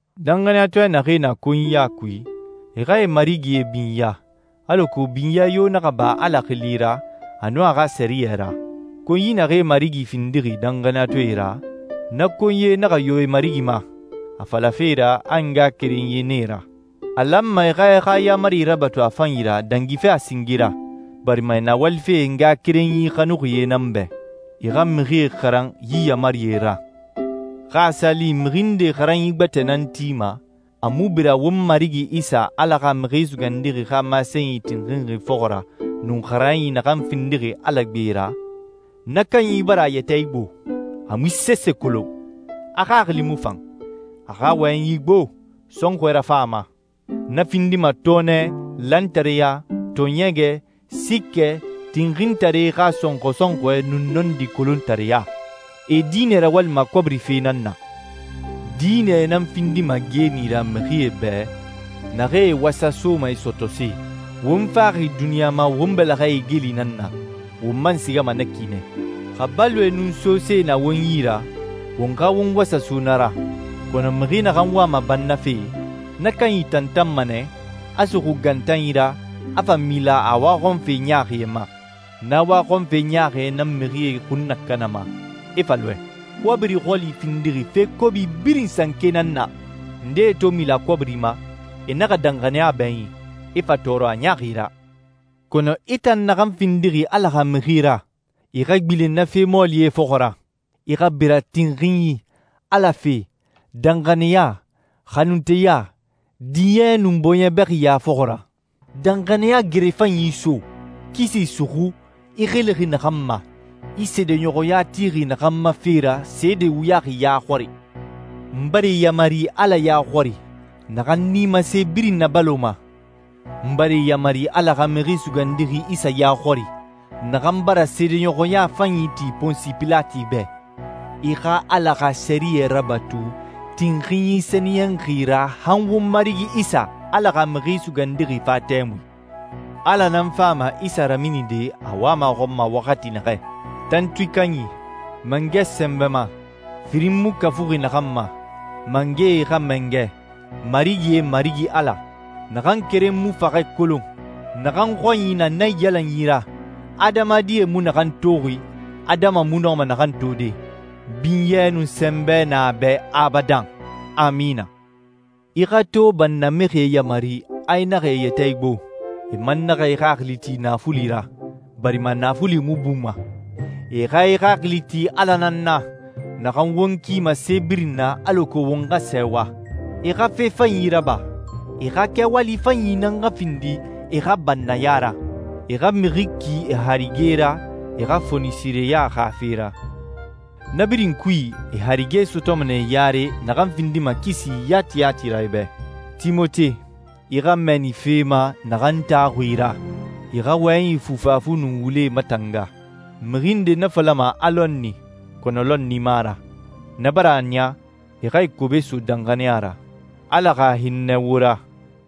Danxaniyatɔɛ naxee na konyiya kui, e xa e marigie binya, alako binyɛ yo naxa ba Ala xili ra, a nun a xa sɛriyɛ ra. Konyi naxee marigi findixi danxaniyatɔɛe ra, na konyie naxa yo e marigi ma, a falafe ra a e ngaxakerenyie nan e ra. A lanma e xa e xa yaamari rabatu a fanyi ra dangife a singe ra, barima e na walife e ngaxakerenyi xanuxie nan bɛ. I xa mixie xaran yi yaamarie ra. Xa a sa li mixi nde xaranyi gbɛtɛ nan tima, a mu bira won Marigi Isa, Ala xa Mixi Sugandixi xa masenyi tinxinxi fɔxɔ ra, nun xaranyi naxan findixi Ala gbe ra, na kanyi bara a yɛtɛ igbo, a mu sese kolon. A xaxili mu fan. A xa wɔyɛnyi gbo, sɔnxɔɛ rafan a ma. Na findima tɔɔnɛ, lantareya, tɔɔɲɛgɛ, siikɛ, tinxintaree xa sɔnxɔ sɔnxɔɛ, nun nɔndi kolontareya. E diinɛ rawalima kɔbiri fe nan na. Diinɛ nan findima geeni ra mixie bɛ, naxee e wasasoma e sɔtɔse. Won faxi duniɲa ma won bɛlɛxɛe igeli nan na, won man sigama na ki nɛ. Xa baloe nun sose na won yi ra, won xa won wasaso na ra. Kɔnɔ mixi naxan wama bannafe, na kanyi tantanma nɛ, a suxu gantanyi ra, a fa mila a waxɔnfe ɲaaxie ma. Na waxɔnfe ɲaaxie nan mixie xun nakanama, e fa lɔɛ. Kɔbiri xɔli findixi fe kobi birin sanke nan na. Ndee to mila kɔbiri ma, e naxa danxaniya bɛɲin, e fa tɔɔrɔ a ɲaaxi ra. Kɔnɔ i tan naxan findixi Ala xa mixi ra, i xa gbilen na fe mɔɔlie fɔxɔ ra. I xa bira tinxinyi, Ala fe, danxaniya, xanunteya, diɲɛ, nun bɔɲɛ bɛxiya fɔxɔ ra. Danxaniya gere fanyi so. Kisi suxu, i xilixi naxan ma, i seedeɲɔxɔya tixi naxan ma fe ra seede wuyaxi ya xɔri. N bara i yamari Ala ya xɔri, naxan nimase birin nabaloma, n bara i yamari Ala xa Mixi Sugandixi Isa ya xɔri, naxan bara seedeɲɔxɔya fanyi ti Ponsi Pilati bɛ, i xa Ala xa sɛriyɛ rabatu tinxinyi sɛniyɛnxi ra han won Marigi Isa, Ala xa Mixi Sugandixi fa tɛmui. Ala nan fama Isa raminide a wama a xɔn ma waxati naxɛ. Tantui Kanyi, Mangɛ Sɛnbɛma, firin mu kafuxi naxan ma, Mangɛe xa Mangɛ, Marigie Marigi Ala, naxan keren mu faxɛ kolon, naxan xɔnyi na naiyalanyi ra, adamadie mu naxan toxi, adama mu nɔma naxan tode. Binyɛ nun sɛnbɛ na a bɛ abadan. Amina. I xa to bannamixie yamari a e naxa e yɛtɛ igbo, e man naxa e xaxili ti naafuli ra, barima naafuli mu buma. E xa e xaxili ti Ala nan na, naxan won kima se birin na alako won xa sɛɛwa. E xa fe fanyi raba. E xa kɛwali fanyi nan xa findi e xa bannaya ra. E xa mixi ki e harige ra e xa fonisireya xa fe ra. Na birin kui e harige sɔtɔma nɛ yare naxan findima kisi yati yati ra e bɛ. Timote, i xa mɛɛni fe ma naxan taxuxi i ra. I xa wɔyɛnyi fufafu nun wule matanga. Mixi ndee na falama a lɔnni, kɔnɔ lɔnni mu a ra. Na bara a niya e xa e kobe so danxaniya ra. Ala xa hinnɛ wo ra.